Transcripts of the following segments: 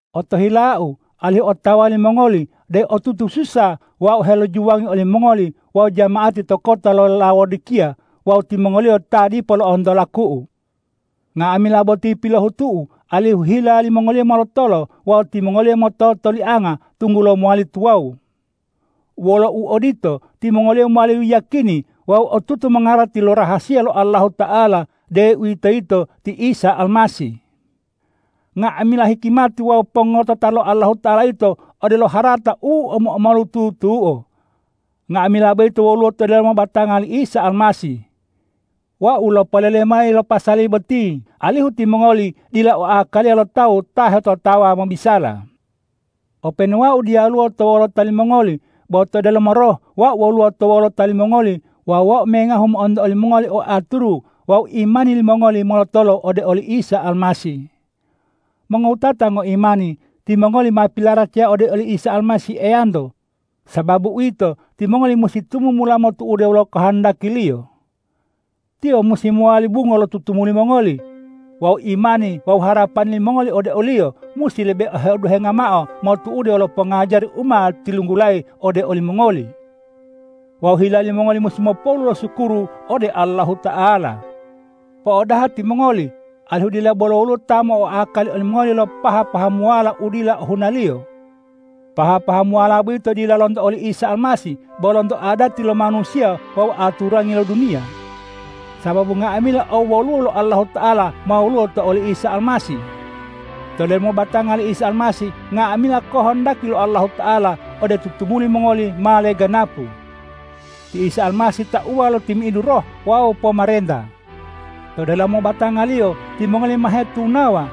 Otohilau alihu otawa limongoli deu otutu susa wau helojuwangi olimongoli wawu jama'ati to kota lo Laodikiya wawu timongoliyo ta dipo lo'onto laku'u. Nga'amila boti pilohutu'u alihu hila limongoliyo molotolo wawu timongoliyo mototolianga, tunggulo mowali tuwawu. Wolo uodito, timongoliyo mowali yiyakini wawu otutu mongarati lo rahasiya lo Allahuta'ala, deuwitoyito ti Isa Almasih. Nga'amila hikimati wawu pongotota lo Allahuta'ala yito odelo harata u omo-omolu tutuo. Nga'amila boyito woluwo to delomo batanga li Isa Almasih. Wau lopolele mayi lo pasali boti, alihu timongoli dila o akaliya lo tawu ta hetotawa mobisala. Openu wau diyaluwo to wolota limongoli, bo to delomo roh wau woluwo to wolota limongoli wawu wau mengahu mo'onto olimongoli o aturu wawu imani limongoli molotolo ode oli Isa Almasih. Mongowutata ngoimani, timongoli ma pilaracaya ode oli Isa Almasih Eyanto. Sababu uwito, timongoli musi tumumula motu'ude wolo kohondaki-Liyo. Tiyo musi mowali bungo lo tutumuli mongoli. Wawu imani wawu harapani limongoli ode o-Liyo musi lebe heoduhenga mao motu'ude wolo pongajari u ma tilunggulayi ode olimongoli. Wawu hila limongoli musi mopolu losukuru ode Allahuta'ala. Po'odaha timongoli, alihu dila bolo woluwo ta mo'oakali olimongoli lo paha-pahamuwala u dila ohunaliyo. Paha-pahamuwala boyito dila lonto oli Isa Almasih, bo lonto adati lo manusiya wawu aturangi lo duniya. Sababu nga'amila owoluwo lo Allahuta'ala ma woluwo to oli Isa Almasih. To delomo batanga li Isa Almasih nga'amila kohondaki lo Allahuta'ala ode tutumuli mongoli ma leganapu. Ti Isa Almasih tauwa lo timi'idu roh wawu pomarenta. To delomo batanga-Liyo timongoli ma hetunawa,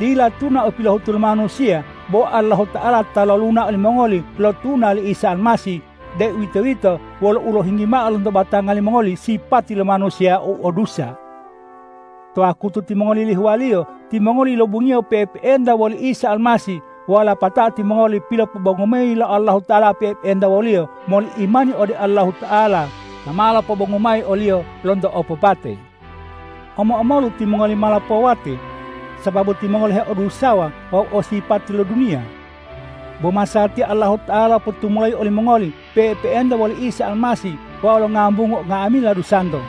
dila tuna u pilohutu lo manusiya, bo Allahuta'ala ta loluna olimongoli lo tuna li Isa Almasih, deuwitoyito wolo ulohinggi mao lonto batanga limongoli sipati lo manusiya u o dusa. To wakutu timongoli yilihuwaliyo timongoli yilobungiyo pe'epe'enta woli Isa Almasih wawu lapatao timongoli pilopobongu mayi lo Allahuta'ala pe'epe'enta wo-Liyo moli imani ode Allahuta'ala ta ma lopobongu mayi o-Liyo lonto opopate. Omo-omolu timongoli ma lopowate, sababu timongoli heodusawa wawu o sipati lo duniya. Bo masatiya Allahuta'ala lopotumulayi olimongoli pe'epe'enta woli Isa Almasih wawu longambungu nga'amila dusanto.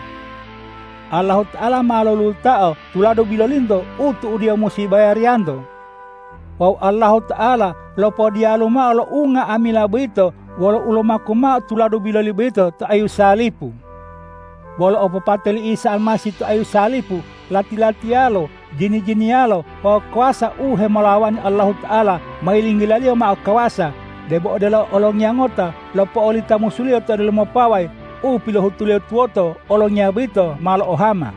Allahuta'ala ma lolulutao tuladu bilolinto u tu'udiyo musi bayariyanto. Wawu Allahuta'ala lopodiyalu mao lo unga'amila boyito wolo ulomaku mao tuladu biloli boyito to ayu salipu. Wolo opopate li Isa Almasih to ayu salipu lati-latiolo, jini-jiniyalo wawu kawasa u hemolawani Allahuta'ala, ma yilinggila-Liyo mao kawasa, debo odelo olongiya ngota lopo'olita musuliyo to delomo pawayi u pilohutuliyo tuwoto olongiya boyito ma lo'ohama.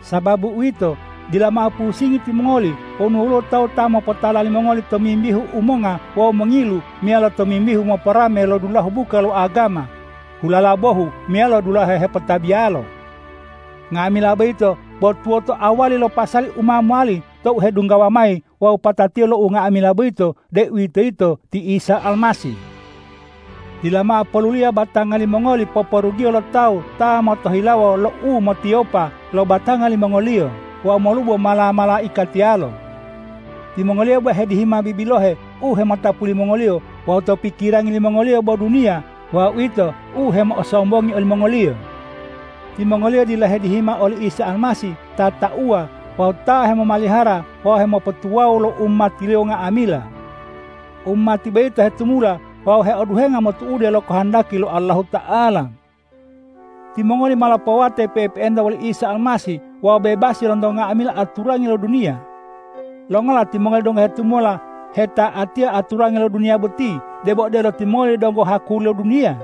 Sababu uwito, dila mao pusingi timongoli wonu woluwo tawu ta mopotala limongoli tomimbihu umonga wawu mongilu meyalo tomimbihu moporame lo dulahu buka lo agama, hulala bohu meyalo dulahe hepotabiyalo. Nga'amila boyito bo tuwota awali lo pasali u ma mowali tou hedunggawa mayi wawu patatiyo lo unga'amila boyito, deuwitoyito ti Isa Almasih. Dila mao poluliya batanga limongoli poporugiyo lo tawu ta motohilawo lo umotiwopa lo batanga limongoliyo wawu molubo mala-malaikatiyalo. Timongoliyo bo hedihima bibilohe u hemotapu limongoliyo wawu to pikirangi limongoliyo bo duniya wawu uwito u hemo'osombongi olimongoliyo. Timongoliyo dila hedihima oli Isa Almasih ta tauwa wawu ta hemomalihara wawu hemopotuwawu lo umati-Liyo nga'amila. Umati boyito hetumula wawu heoduhenga motu'ude lo kohondaki lo Allahuta'ala. Timongoli ma lopowate pe'epe'enta woli Isa Almasih wawu bebasi lonto nga'amila aturangi lo duniya. Longola timongoli donggo hetumula heta'atiya aturangi lo duniya boti, debo odelo timongoli donggo hakuliyo lo duniya?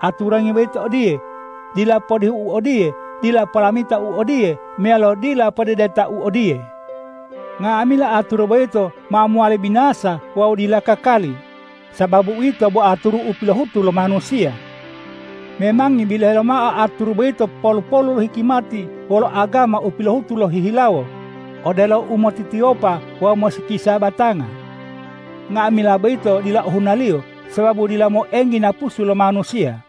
Aturangi boyito odiye,”Dila podihu u odiye, dila polamita u odiye meyalo dila podedeta u odiye.” Nga'amila aturu boyito ma mowali binasa wawu dila kakali, sababu uwito bo aturu u pilohutu lo manusiya. Memangi bilohe mao aturu boyito polu-polu lo hikimati wolo agama u pilohutu lohihilawo, odelo umotitiwopa wawu mosikisa batanga. Nga'amila boyito dila ohunaliyo, sababu dila moenggi napusu lo manusiya.